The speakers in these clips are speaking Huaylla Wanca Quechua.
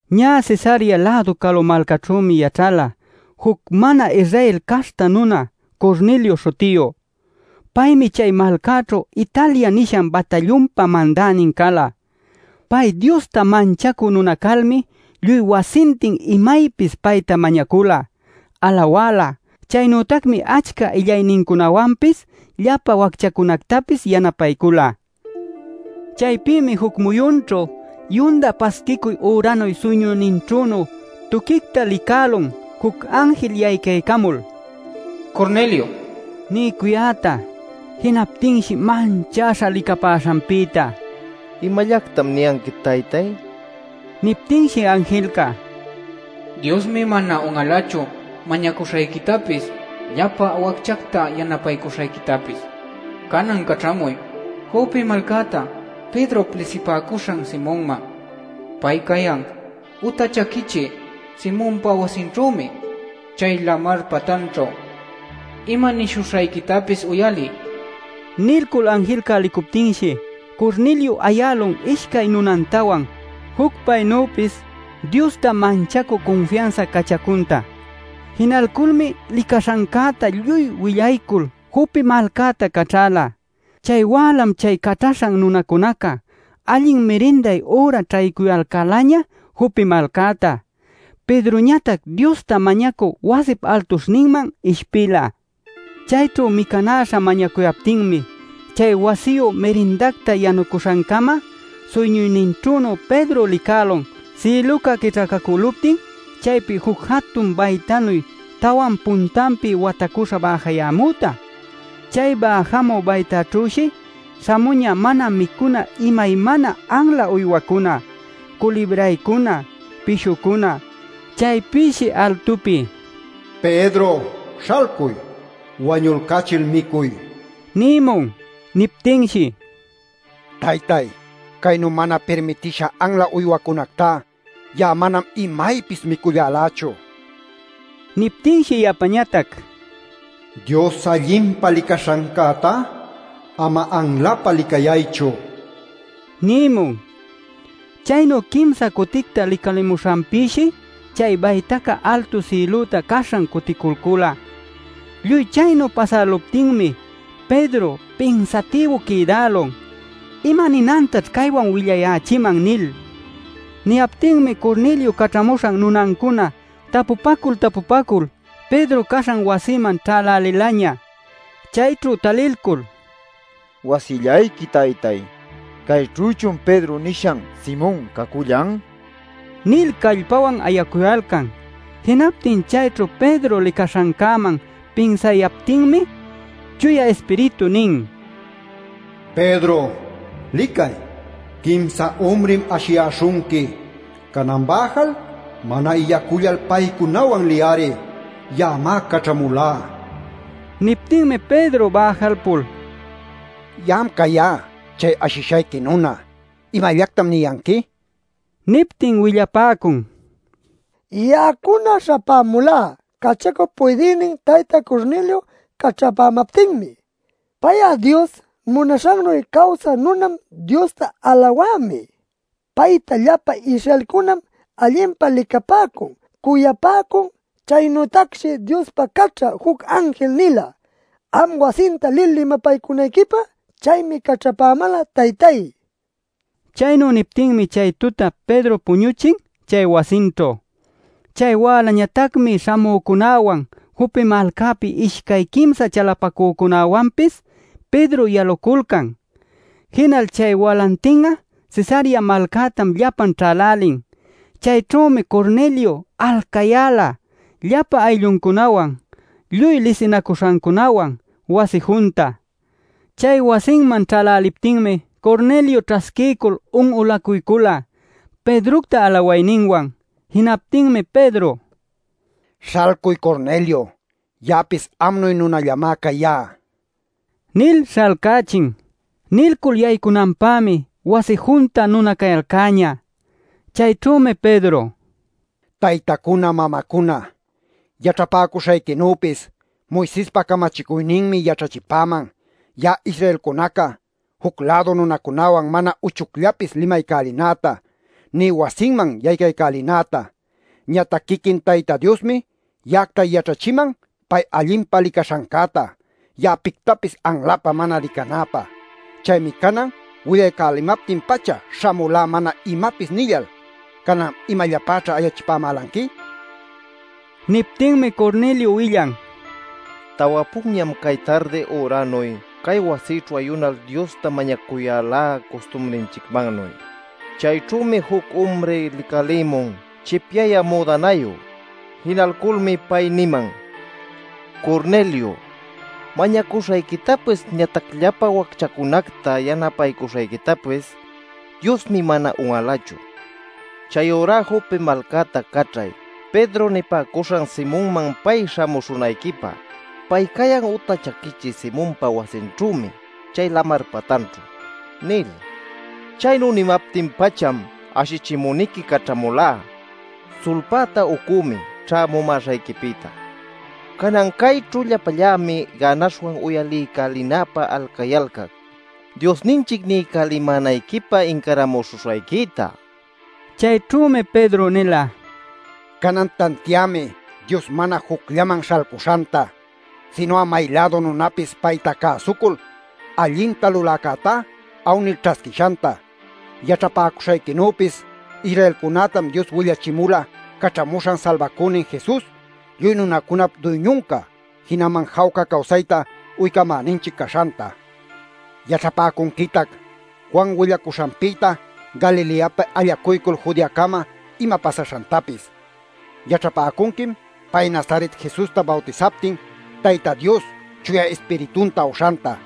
Ñä Cesarea-lädu calu malcaćhümi yaćhala juc mana-Israel caśhta nuna Cornelio śhutiyu. Paymi chay malcaćhu Italia nishan batallunpa mandänin cala. Pay Diosta manchacü nuna calmi lluy wasintin imaypis payta mañacula, alawala. Chaynütacmi achca illaynincunawanpis llapa wacchacunactapis yanapaycula. Chaypïmi juc muyunćhu yunda pasquicuy üranuy suyñuyninćhünu tuquicta licälun juc anjil yaycaycamul “Cornelio” niycuyäta. Jinaptinshi manchäśha licapäśhanpïta: “¿Imallactam niyanqui, taytay?” nin. Niptinshi anjilca: “Diosmi mana un'alachu mañacuśhayquitapis llapa wacchacta yanapaycuśhayquitapis. Canan caćhamuy Jope malcäta Pedrop lisipäcuśhan Simonman. Pay cayan uta chaquichï Simonpa wasinćhümi, chay lamar patanćhu. ˻Ima nishuśhayquitapis uyaliy” nin.˼ Nilcul anjilca licuptinshi Cornelio ayälun ishcay nunantawan juc paynüpis Diosta manchacü cunfiansa cachacunta. Jinalculmi licaśhancäta lluy willaycul Jope malcäta caćhäla. Chay wälam chay caćhaśhan nunacunaca allin mirinday üra ćhaycuyalcälaña Jope malcäta. Pedroñatac Diosta mañacü wasip altuśhninman ishpila. Chayćhu micanäśha mañacuyaptinmi, chay wasiyu mirindacta yanuśhancama suyñuyninćhünu Pedro licälun sïluca quićhacacalcuptin chaypi juc jatun baytanuy tawan puntanpi watacuśha bäjayämüta. Chay bäjamü baytaćhüshi śhamuñä mana micuna imaymana anla uywacuna, culibraycuna, pishucuna. Chaypïshi altupi: “Pedro śhalcuy; wañulcachil micuy” nïmun. Niptinshi: “Taytay, caynu mana pirmitisha anla uywacunactá ya'a manam imaypis micullalächu” nin. Niptinshi yapañatac: “Dios allinpa licaśhancätá, ama anlapä licayaychu” nïmun. Chaynu quimsa cuticta licalïmuśhanpïshi chay bayta altu sïlüta caśhan cuticulcula. Lluy chaynu pasäluptinmi Pedro pinsatïbu quïdälun “¿Ima ninantaćh caywan willayächiman?” nil. Niyaptinmi Cornelio caćhacamuśhan nunancuna tapupacu-tapupacul Pedro caśhan wasiman ćhälälilaña. Chayćhu talilcul “Wasillayqui taytay. ¿Cayćhüchun Pedro nishan Simon cacullan?” nil callpawan ayacuyalcan. Jinaptin chayćhu Pedro licaśhancäman pinsayaptinmi Chuya Ispiritu nin: “Pedro, licay, quimsa umrim ashiyäśhunqui. Canan bäjal, mana illacullal paycunawan liy-ari. Ya'amá caćhamulá” nin. Niptinmi Pedro bäjalpul: “Ya'am cayá chay ashishayqui nuna. ¿Imallactam niyanqui?” nin. Niptin willapäcun: “Ya'acuna śhapämulá cachacup puydïnin tayta Cornelio caćhapämaptinmi. Pay'a Dios munaśhannuy cawsä nunam, Diosta alawämi. Paytá llapa Israelcunam allinpa licapäcun, cuyapäcun. Chaynütacshi Diospi caćha juc anjil nila am wasinta lil limapaycunayquipä. Chaymi caćhapämäla, taytay” nin. Chaynu niptinmi chay tuta Pedro puñuchin chay wasinćhu. Chay wälañatacmi śhamücunäwan Jope malcapi ishcay quimsa chalapacücunawanpis Pedro yaluculcan. Jinal chay walantin'a Cesarea malcätam llapan ćhälälin. Chayćhümi Cornelio alcayäla, llapa aylluncunawan, lluy lisinacuśhancunawan wasi junta. Chay wasinman ćhäläliptinmi Cornelio ćhasquiycul un'ulacuycula Pedrocta alawayninwan. Jinaptinmi Pedro: “Śhalcuy Cornelio, ya'apis amnuy nunallamá cayá” nil śhalcächin. Nilcul yaycunanpämi wasi junta nuna cayalcäñä. Chayćhümi Pedro: “Taytacuna mamacuna, yaćhapäcuśhayquinüpis Moisespa camachicuyninmi yaćhachipäman ya'a Israelcunaca, juc-lädu nunacunawan mana uchucllapis limaycälinäta, nï wasinman yaycaycälinäta. Ñatac quiquin Tayta Diosmi ya'acta yaćhachiman pay allinpa licaśhancäta, ya'a pictapis anlapä mana licanäpä. Chaymi canan willaycamaptin-pacha śhamulá mana imapis nillal. Canan ¿imallapäćha ayachipämälanqui?” nin. Niptinmi Cornelio willan: “Tawa punñam cay tardi üranuy, cay wasïćhu ayunal Diosta mañacuyälá, custumrinchicmannuy. Chayćhümi juc umri licalïmun chipyayä müdanayu. Jinalculmi pay niman: ‘Cornelio, mañacuśhayquitapis ñatac llapa wacchacunacta yanapaycuśhayquitapis Diosmi mana un'alachu. Chayurá Jope malcäta caćhay Pedro nipäcuśhan Simonman pay śhamuśhunayquipä. Pay cayan uta chaquichï Simonpa wasinćhümi, chay lamar patanćhu’ nil. Chaynu nimaptin-pacham ashichimüniqui caćhamulá. Sulpäta ucümi ćhämumäśhayquipïta. Canan cayćhu llapallämi gänaśhwan uyaliycälinäpä alcayalcac, Diosninchic niycälimänayquipä incaramuśhuśhayquita” nin. Chayćhümi Pedro nila: “Canan tantiämi Dios mana jucllanman śhalcuśhanta, sinu'a may-lädu nunapis payta cäsucul allinta luläcätá awnil ćhasquishanta. Yaćhapäcuśhayquinüpis Israelcunätam Dios willachimula Caćhamuśhan Salbacünin Jesus lluy nunacunap duyñunca, jinaman jawca cawsayta uycamänanchic caśhanta. Yaćhapäcunquitac, Juan willacuśhanpïta Galileapi allacuycul Judeacama ima pasaśhantapis. Yaćhapäcunquim pay Nazaret Jesusta bawtisaptin, Tayta Dios Chuya Ispiritunta uśhanta.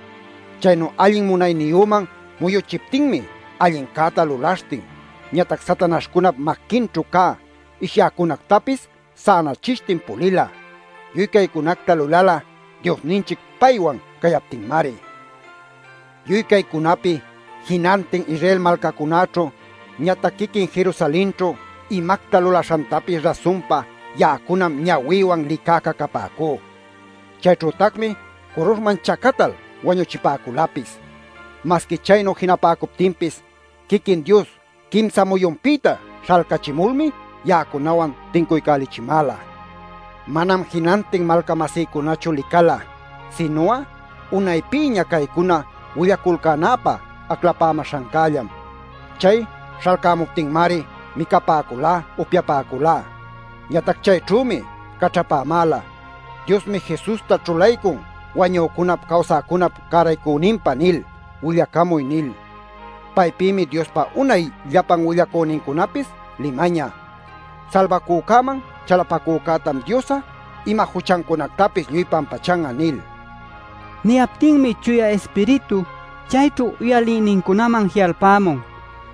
Chaynu allin munayniyüman muyuchiptinmi allincäta lulaśhtin, ñatac satanaśhcunap maquinćhu cä ishyäcunactapis sänachishtin pulila. Lluy caycunacta lulala Diosninchic paywan cayaptinmari. “Lluy caycunapi jinantin Israel malcacunäćhu, ñatac quiquin Jerusalenćhu imacta lulaśhantapis rasunpa ya'acunam ñawïwan licäca capäcú. Chayćhütacmi curuśhman chacatal wañuchipäculapis. Masqui chaynu jinapäcuptinpis quiquin Dios quimsa muyunpïta śhalcachimulmi ya'acunawan tincuycälichimäla. Manam jinantin malca-masïcunachu licala, sinu'a unaypïña caycuna willaculcänäpä aclapämäśhancällam. Chay śhalcämuptinmari micapäculá, upyapäculá. Ñatac chayćhümi caćhapämäla: ‘ “Diosmi Jesusta ćhulaycun wañücunap cawsäcunap cäraycüninpä” nil willacamuy’ nil. Paypïmi Diospa unay llapan willacünincunapis limañä: ‘Salbacücäman chalapacücätam Dios'a ima juchancunactapis lluy pampachan'a’ nil” nin. Niyaptinmi Chuya Ispiritu chayćhu uyalïnincunaman ji'alpämun.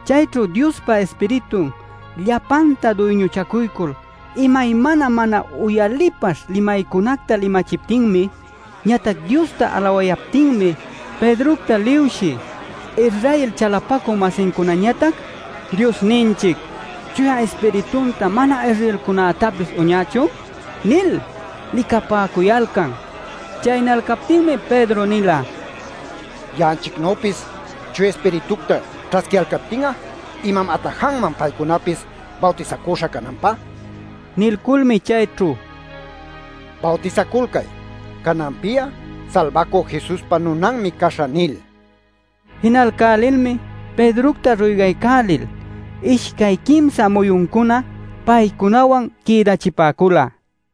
Chayćhu Diospa Ispiritun llapanta duyñuchacuycul imaymana mana uyalipaśh limaycunacta limayächiptinmi, ñatac Diosta alawayaptinmi, Pedrocta liwshï Israel chalapacü-masincunañatac: “¿Diosninchic Chuya Ispiritunta mana-Israelcunactapis uñächun?” nil licapäcuyalcan. Chaynalcaptinmi Pedro nila: “Ya'anchicnüpis Chuya Ispiritucta ćhasquiyalcaptin'a ¿imam atajanman paycunapis bawtisacüśha cananpä?” nil. Nilculmi chayćhu: “Bawtisaculcay ‘Cananpi'a Salbacü Jesuspa nunanmi caśhä’ nil” nin. Jinalcälilmi Pedrocta ruygaycälil ishcay quimsa muyuncuna paycunawan quïdachipäcula.